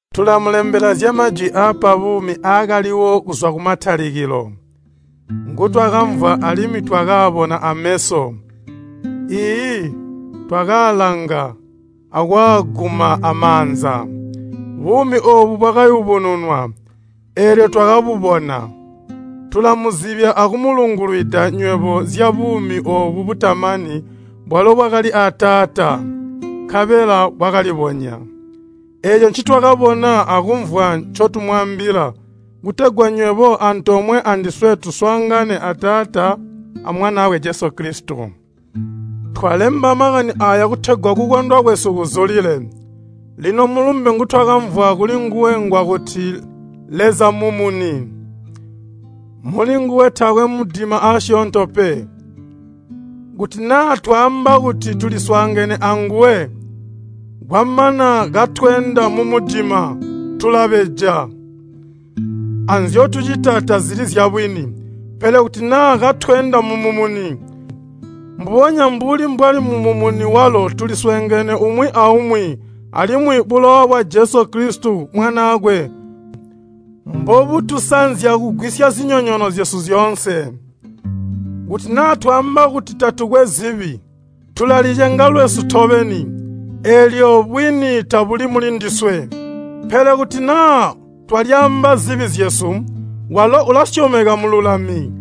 Tulamulembela zya Majwi aapa buumi aakaliwo kuzwa kumatalikilo, ngutwakamvwa alimwi twakaabona ameso, iiyi, twakaalanga akwaaguma amaanza. Buumi oobu bwakayubununwa, eelyo twakabubona. Tulamuzibya akumulungulwida nywebo zya buumi oobu butamani bwalo bwakali a Taata, nkabela bwakalibonya. Eeco ncitwakabona akumvwa ncotumwaambila kutegwa nywebo antoomwe andiswe tuswaangane a Taata a Mwanaakwe Jesu Kilisito. Twalemba makani aaya kutegwa kukondwa kwesu kuzulile. Lino mulumbe ngutwakamvwa kulinguwe ngwakuti Leza mmumuni. Mulinguwe taakwe mudima aasyoonto pe. Kuti naa twaamba kuti tuliswaangene anguwe, kwamana katweenda mumudima, tulabeja, anzyotucita tazili zyabwini. Pele kuti naa katweenda mumumuni, mbubonya mbuli mbwali mumumuni walo tuliswaangene umwi aumwi, alimwi bulowa bwa Jesu Kilisito Mwanaakwe mbobutusanzya kugwisya zinyonyoono zyesu zyoonse. Kuti naa twaamba kuti tatukwe zibi, tulalicenga lwesu tobeni, eelyo bwini tabuli muli ndiswe. Pele kuti naa twalyaamba zibi zyesu, walo ulasyomeka mmululami,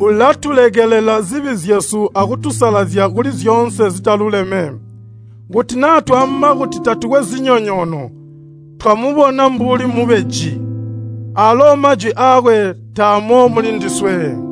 ulatulekelela zibi zyesu akutusalazya kuli zyoonse zitaluleme. Kuti naa twaamba kuti tatukwe zinyonyoono, twamubona mbuli mubeji, aalo majwi aakwe taamo mulindiswe.